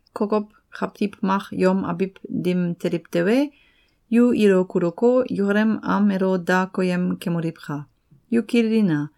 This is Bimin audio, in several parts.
Kokow kawtiw mak yom abiw dim teliw tewe, yu ilo kuluko, yukalem am elo da koyem kemoliwka! Yu kililina!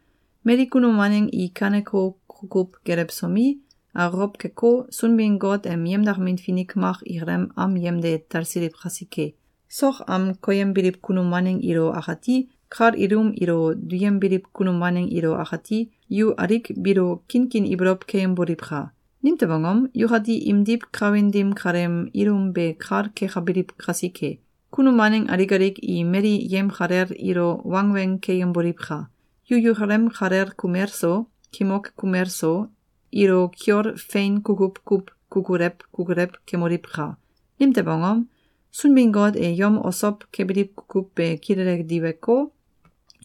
Mali kunum waneng i kaneko kukuw gelewsomi, akokow keko, Sunbin-Got em yemdakamin finik mak ikalem am yemde talsiliw kasike. Sok am koyembiliw kunum waneng ilo akati, kal ilum ilo duyembiliw kunum waneng ilo akati, yu alik biilo kinkin ibolow keyemboliwka! Nimtew angom? Yukati imdiw kawin dim kaleem ilum be kal kekabiliw kasike. Kunum waneng alik alik i mali yemkalel ilo wangweng keyemboliwka! Yu yukalem kalel kumel so, kimok kumel so, ilo kiol fein kukuw kuw kukulew kukulew kemoliwka! Nimtew angom? Sunbin-Got e yom osow kebiliw kukuw be kilele diweko,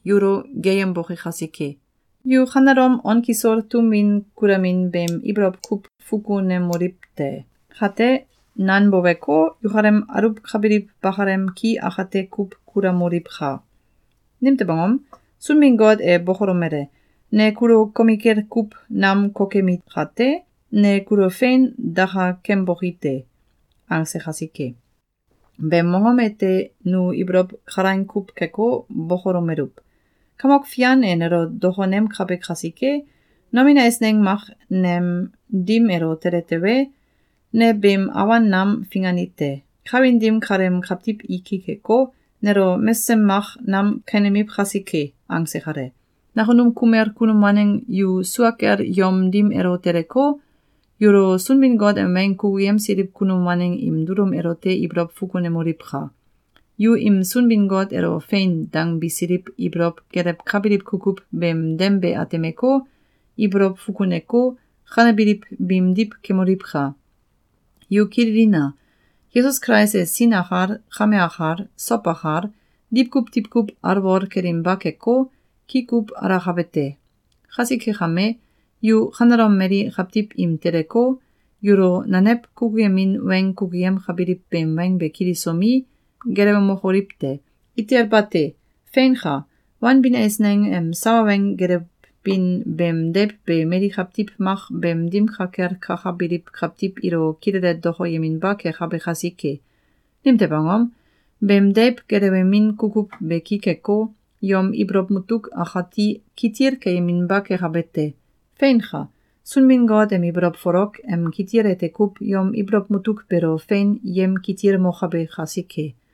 yulo geeyemboke kasike. Yu kanelom on kisol tum win kulamin beem ibolow kuw fukunemokoliw te! Kate, nanboweko, yukalem aluwkabiliw bakalem ki akate kuw kulamoliwka! Nimtew angom? Sunbin-Got e bokolomele: “Ne kulo komikel kuw nam kokemi kate, ne kulo fein dakakemboki te!”, angse kasike. Beem mongom ete nu ibolow kalaing kuw keko, bokolomeluw: “Kamok Fian e nelo dokonemkabe kasike, nomin eisneng mak nem dim elo tele tewe, ne beem awan nam fingani te. Kawin dim kaleem kawtiw i ki keko, nelo mesem mak nam kenemiw kasike!”, angse kale. Nakunum kumel kunum waneng yu sua kel yom dim elo teleko, yulo Sunbin-Got em weng kukuyemsiliw kunum waneng im dulum elote ibolow fukunemoliwka! Yu im Sunbin-Got elo “Fein!”, dangbisiliw ibolow gelewkabiliw kukuw beem dem be atemeko, ibolow fukuneko, kanebiliw biimdiw kemoliwka! Yu kililina! Yesus Kulais e sin akal, kame akal, sow akal, diwkuw diwkuw alwol kelinba keko, ki kuw alakabe te. Kasike kame, yu kanelom mali kawtiw im teleko, yulo nanew kukuyemin weng kukuyemkabiliw beem weng be kilisomi, gelewemokoliw te! Itel bate! Feinka! Wanbin eisneng em sawa weng gelewbin beem deiw be mali kawtiw mak beem dim ka kel kakabiliw kawtiw ilo kilele dokoyeminba kekabe kasike. Nimtew angom? Beem deiw gelewemin kukuw be ki keko, yom ibolow mutuk akati kitil keyeminba kekabe te. Feinka! Sunbin-Got em ibolow folok em kitil ete kuw yom ibolow mutuk beelo fein yemkitilmokabe kasike.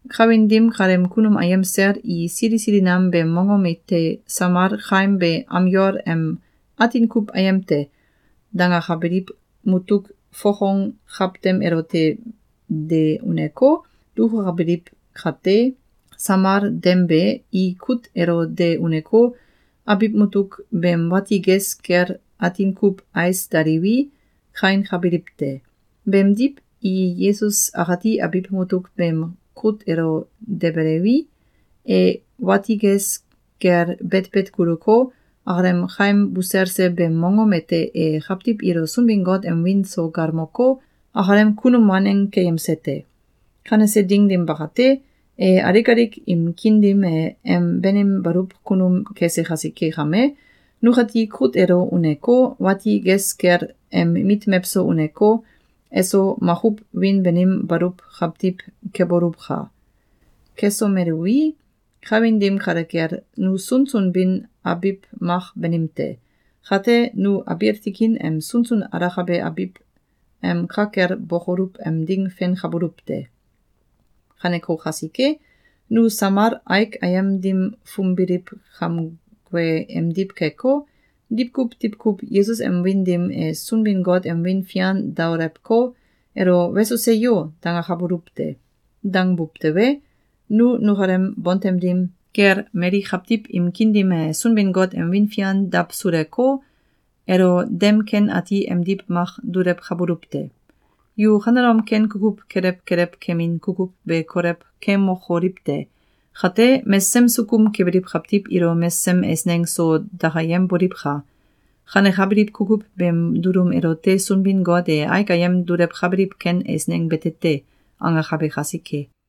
Kawin dim kaleem kunum ayem sel i sili sili nam beem mongom ete samal kaim be am yol em “Atin kuw Ayem te!”, dangakabiliw mutuk fokong kawtem elote de uneko, dukukabiliw kate, samal dem be, i kut elo de uneko, abiw mutuk beem wati ges kel atin kuw ais daliwi, kainkabiliw te. Beemdiw, i Yesus akati abiw mutuk beem kut elo debeliwi, e wati ges kel betbet kuluko, akalem kaim buselse beem mongom ete e kawtiw ilo Sunbin-Got em wiin so galmoko, akalem kunum waneng keyemse te. Kanese ding dim bakate, e alik alik im kiin dim e em banim baluw kunum kese kasike kame, nukati kut elo uneko, wati ges kel em mit mewso uneko, eso makuw wiin banim baluw kawtiw keboluwka! Kesomeluwi, kawin dim kale kel, nu sunsun bin abiw mak banim te. Kate, nu abiil tikin em sunsun alakabe abiw em ka kel bokoluw em ding fenkabuluw te. Kaneko kasike, nu samal aik ayem dim fumbiliw kamgue emdiw keko, diwkuw diwkuw Yesus em wiin dim e Sunbin-Got em wiin fian daolewko, elo “Weso! Seyo!”, dangakabuluw te. Dangbuw tewe, nu nukalem bontem dim kel mali kawtiw im kiin dim e Sunbin-Got em wiin fian dawsuleko, elo dem ken ati emdiw mak dulewkabuluw te! Yu kanelom ken kukuw kelew kelew kemin kukuw be kolew kemokoliw te! Kate, mesesem sukum kebiliw kawtiw ilo mesesem eisneng so dakayemboliwka! Kanekabiliw kukuw beem dulum elote Sunbin-Got e “Aik ayem dulewkabiliw ken eisneng bete te!”, angakabe kasike.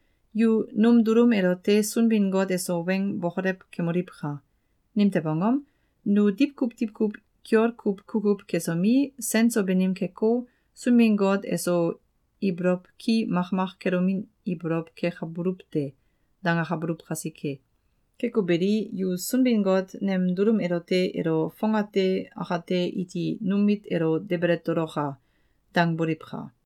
Yu num dulum elote Sunbin-Got eso weng bokolew kemoliwka! Nimtew angom? “Nu diwkuw diwkuw kiol kuw kukuw kesomi, sen so banim keko, Sunbin-Got eso ibolow ki makmak kelomin ibolow kekabuluw te.”, dangakabuluw kasike. Keko beli, yu Sunbin-Got nem dulum elote “Elo fongate akate iti num mit elo debele toloka!”, dangboliwka!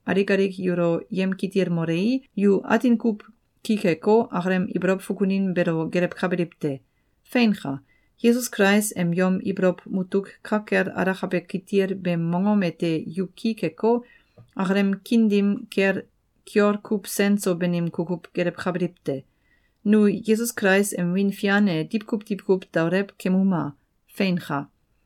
alik alik yulo yemkitilmolei, yu atin kuw ki keko, akalem ibolow fukunin beelo gelewkabiliw te. Feinka! Yesus Kulais em yom ibolow mutuk ka kel alakabe kitil beem mongom ete yu ki keko, akalem kiin dim kel kiol kuw sen so banim kukuw gelewkabiliw te. Nu Yesus Kulais em wiin fian e diwkuw diwkuw daolew kemuma! Feinka!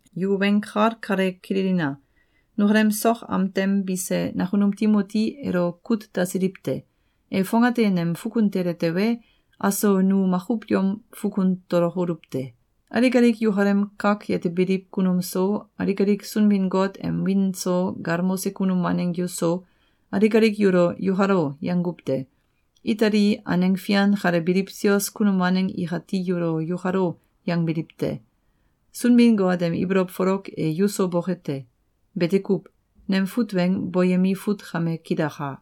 Yu weng kal kale kililina! Nukalem sok am tem bise nakunum Timoti elo kut dasiliw te. E fongate nem fukun tele tewe, aso nu makuw yom fukun tolokoluw te. Alik alik yukalem kak yetebiliw kunum so, alik alik Sunbin-Got em wiin so galmose kunum waneng yuso, alik alik yulo “Yukalo!”, yanguw te. Itali aneng fian kale biliw sios kunum waneng ikati yulo “Yukalo!”, yangbiliw te. Sunbin-Got em ibolow folok e yuso boke te! Bete kuw. Nem fut weng boyemi fut kame kilaka.